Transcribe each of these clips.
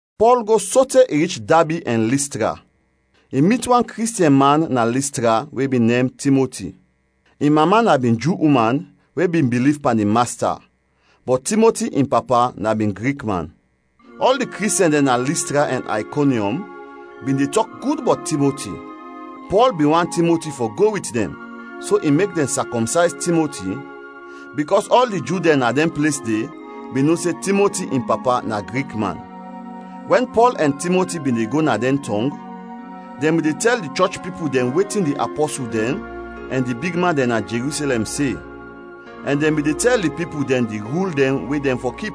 Pɔl go sote i rich Dabi ɛn Listra. I mit wan Kristiɛn man na Listra we bin nem Timoti. In mama na bin Ju uman we bin biliv pan di Masta, bɔt Timoti in papa na bin Grik man. Ɔl di Kristiɛn dɛn na Listra ɛn Aykonyɔm bin de tɔk gud bɔt Timoti. Pɔl bin want Timoti fɔ go wit dɛn, so i mek dɛn sakɔmsayz Timoti, bikɔs ɔl di Ju dɛn na dɛn ples de, bin no se Timoti in papa na Grik man. Wɛn Pɔl ɛn Timoti bin de go na dɛn tɔng, dɛn bin de tɛl di chɔch pipul dɛn wetin di apɔsul dɛn ɛn di bigman dɛn na Jerusɛlɛm se ɛn dɛn bin de tɛl di pipul dɛn di rul dɛn we dɛn fɔ kip.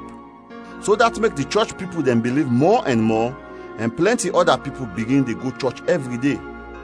So dat mek di chɔch pipul dɛn biliv mɔ ɛn mɔ ɛn plɛnti ɔda pipul bigin de go chɔch ɛvri de.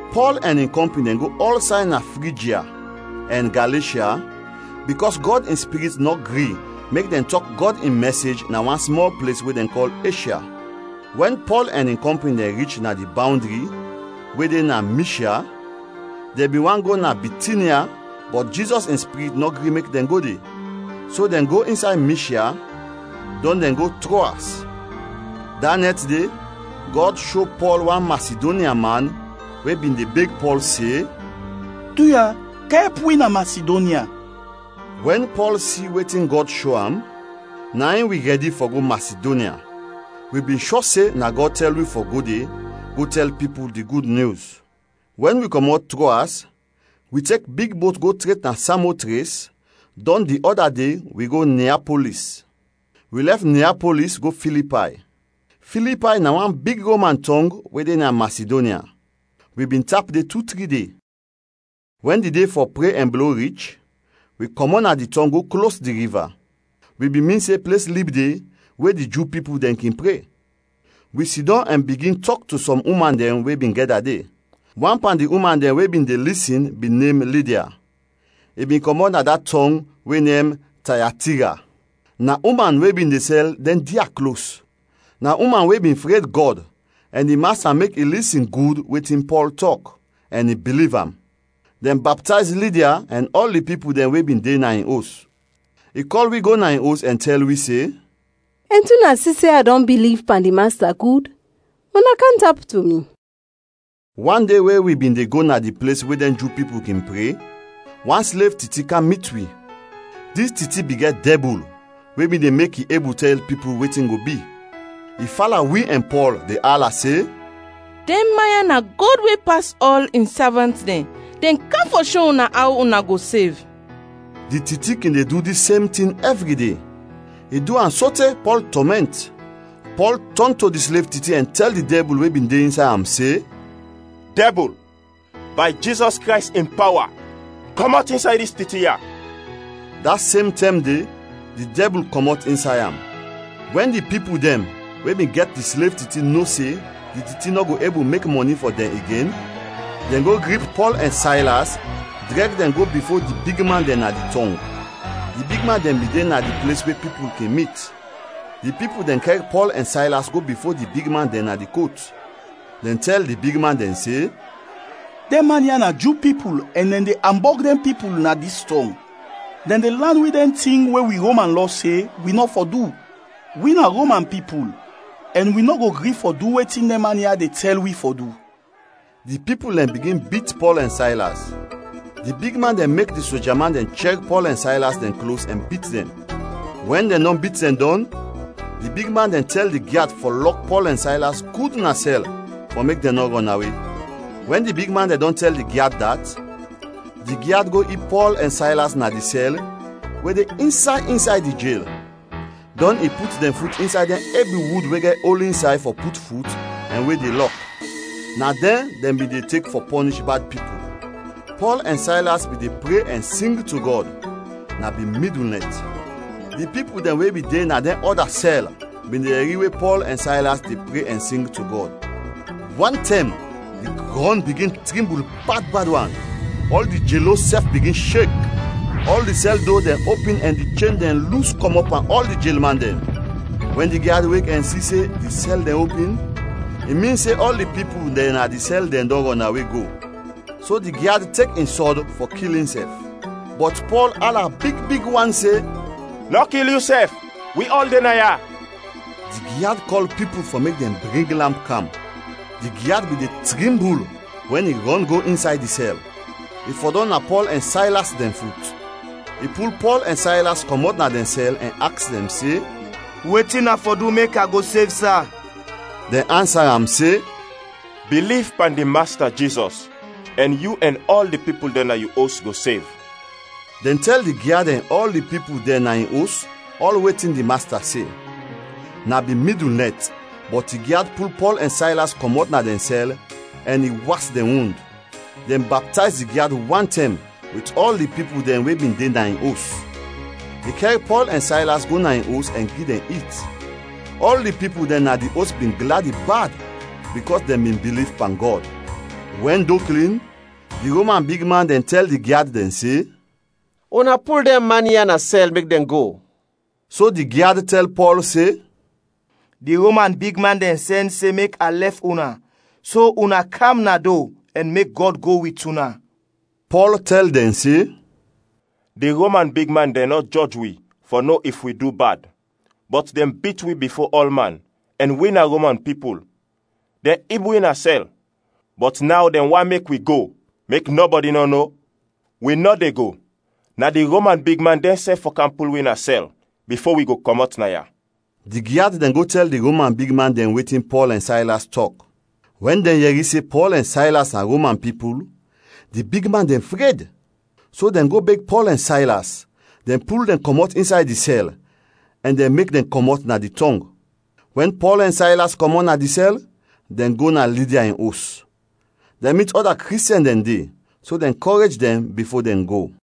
Pɔl ɛn in kɔmpin dɛn go ɔlsay na Frijya ɛn Galeshya bikɔs Gɔd in Spirit nɔ gri mek dɛn tɔk Gɔd in mɛsej na wan smɔl ples we dɛn kɔl Eshya. Wɛn Pɔl ɛn in kɔmpin dɛn rich na di bawndri we de na Mishya, dɛn bin want go na Bitinya bɔt Jizɔs in Spirit nɔ gri mek dɛn go de. So dɛn go insay Mishya, dɔn dɛn go Troas. Da nɛt de, Gɔd sho Pɔl wan Masidonya man we bin de beg Pɔl se, “Duya, kam ɛp wi na Masidonya.” Wɛn Pɔl si wetin Gɔd sho am, na in wi rɛdi fɔ go Masidonya. Wi bin shɔ se na Gɔd tɛl wi fɔ go de go tɛl pipul di Gud Nyus. Wɛn wi kɔmɔt Troas, wi tek big bot go tret na Samotres, dɔn di ɔda de, wi go Niapolis. Wi lɛf Niapolis go Filipay. Filipay na wan big Roman tɔng we de na Masidonya; wi bin tap de tu tri de. Wɛn di de fɔ pre ɛn blo rich, wi kɔmɔt na di tɔng go klos di riva. Wi bin min se ples lib de we di Ju pipul dɛn kin pre. Wi sidɔm ɛn bigin tɔk to sɔm uman dɛn we bin gɛda de. Wan pan di uman dɛn we bin de lisin bin nem Lidia, i bin kɔmɔt na da tɔng we nem Tayatira. Na uman we bin de sɛl dɛn dia klos. Na uman we bin fred Gɔd ɛn di Masta mek i lisin gud wetin Pɔl tɔk, ɛn i biliv am. Dɛn baptayz Lidia ɛn ɔl di pipul dɛn we bin de na in os. I kɔl wi go na in os ɛn tɛl wi se, “Ɛnti una si se a dɔn biliv pan di Masta gud, una kam tap to mi.” Wan de we wi bin de go na di ples we dɛn Ju pipul kin pre, wan slev titi kam mit wi. Dis titi bin gɛt dɛbul we bin de mek i ebul tɛl pipul wetin go bi. I fala wi ɛn Pɔl de ala se, “Dɛn man ya na Gɔd we pas ɔl, in savant dɛn! Dɛn kam fɔ sho una aw una go sev!” Di titi kin de du dis sem tin ɛvri de. I du am sote Pɔl tɔmɛnt. Pɔl tɔn to di slev titi ɛn tɛl di dɛbul we bin de insay am se, “Dɛbul, bay Jizɔs Krays in pawa, kɔmɔt insay dis titi ya!” Da sem tɛm de, di dɛbul kɔmɔt insay am. Wɛn di pipul dɛn we bin gɛt di slev titi no se di titi nɔ go ebul mek mɔni fɔ dɛn igen, dɛn go grip Pɔl ɛn Saylas drɛg dɛn go bifo di bigman dɛn na di tɔng; di bigman dɛn bin de na di ples we pipul kin mit. Di pipul dɛn kɛr Pɔl ɛn Saylas go bifo di bigman dɛn na di kot. Dɛn tɛl di bigman dɛn se, “Dɛn man ya na Ju pipul ɛn dɛn de ambɔg dɛn pipul na dis tɔng. Dɛn de lan wi dɛn tin we wi Roman lɔ se wi nɔ fɔ du. Wi na Roman pipul ɛn wi nɔ go gri fɔ du wetin dɛn man ya de tɛl wi fɔ du.” Di pipul dɛn bigin bit Pɔl ɛn Saylas. Di bigman dɛn mek di soja man dɛn chɛr Pɔl ɛn Saylas dɛn klos ɛn bit dɛn. Wɛn dɛn dɔn bit dɛn dɔn, di bigman dɛn tɛl di gyad fɔ lɔk Pɔl ɛn Saylas gud na sɛl fɔ mek dɛn nɔ rɔnawe. Wɛn di bigman dɛn dɔn tɛl di gyad dat, di gyad go ib Pɔl ɛn Saylas na di sɛl we de insay insay di jel; dɔn i put dɛn fut insay dɛn ebi wud we gɛt ol insay fɔ put fut ɛn we de lɔk. Na dɛn dɛn bin de tek fɔ pɔnish bad pipul. Pɔl ɛn Saylas bin de pre ɛn sing to Gɔd; na bin midul nɛt. Di pipul dɛn we bin de na dɛn ɔda sɛl bin de yɛri we Pɔl ɛn Saylas de pre ɛn sing to Gɔd. Wantɛm, di grɔn bigin trimbul bad bad wan; ɔl di jelos sɛf bigin shek. Ɔl di sɛl do dɛn opin ɛn di chen dɛn lus kɔmɔt pan ɔl di jelman dɛn. Wɛn di gyad wek ɛn si se di sɛl dɛn opin, i min se ɔl di pipul dɛn na di sɛl dɛn dɔn rɔnawe go, so di gyad tek in sɔd fɔ kil insɛf. Bɔt Pɔl ala big big wan se, “Nɔ kil yusɛf. Wi ɔl de naya!” Di gyad kɔl pipul fɔ mek dɛn bring lamp kam. Di gyad bin de trimbul wɛn i rɔn go insay di sɛl, i fɔdɔm na Pɔl ɛn Saylas dɛn fut. I pul Pɔl ɛn Saylas kɔmɔt na dɛn sɛl ɛn aks dɛn se, “Wetin a fɔ du mek a go sev, sa?” Dɛn ansa am se, “Biliv pan di Masta, Jizɔs, ɛn yu ɛn ɔl di pipul dɛn na yu os go sev.” Dɛn tɛl di gyad ɛn ɔl di pipul dɛn na in os ɔl wetin di Masta se. Na bin midul nɛt, bɔt di gyad pul Pɔl ɛn Saylas kɔmɔt na dɛn sɛl ɛn i was dɛn wund. Dɛn baptayz di gyad wantɛm wit ɔl di pipul dɛn we bin de na in os. I kɛr Pɔl ɛn Saylas go na in os ɛn gi dɛn it. Ɔl di pipul dɛn na di os bin gladi bad bikɔs dɛn bin biliv pan Gɔd. Wɛn do klin, di Roman bigman dɛn tɛl di gyad dɛn se, “Una pul dɛn man ya na sɛl mek dɛn go.” So di gyad tɛl Pɔl se, “Di Roman bigman dɛn sɛn se mek a lɛf una so una kam na do ɛn mek Gɔd go wit una!” Pɔl tɛl dɛn se, “Di Roman bigman dɛn nɔ jɔj wi fɔ no if wi du bad bɔt dɛn bit wi bifo ɔlman ɛn wi na Roman pipul! Dɛn ib wi na sɛl, bɔt naw dɛn want mek wi go mek nɔbɔdi nɔ no? Wi nɔ de go! Na di Roman bigman dɛnsɛf fɔ kam pul wi na sɛl bifo wi go kɔmɔt naya.” Di gyad dɛn go tɛl di Roman bigman dɛn wetin Pɔl ɛn Saylas tɔk. Wɛn dɛn yɛri se Pɔl ɛn Saylas na Roman pipul, di bigman dɛn fred. So dɛn go beg Pɔl ɛn Saylas, dɛn pul dɛn kɔmɔt insay di sɛl, ɛn dɛn mek dɛn kɔmɔt na di tɔng. Wɛn Pɔl ɛn Saylas kɔmɔt na di sɛl, dɛn go na Lidia in os. Dɛn mit ɔda Kristiɛn dɛn de, so dɛn kɔrej dɛn bifo dɛn go.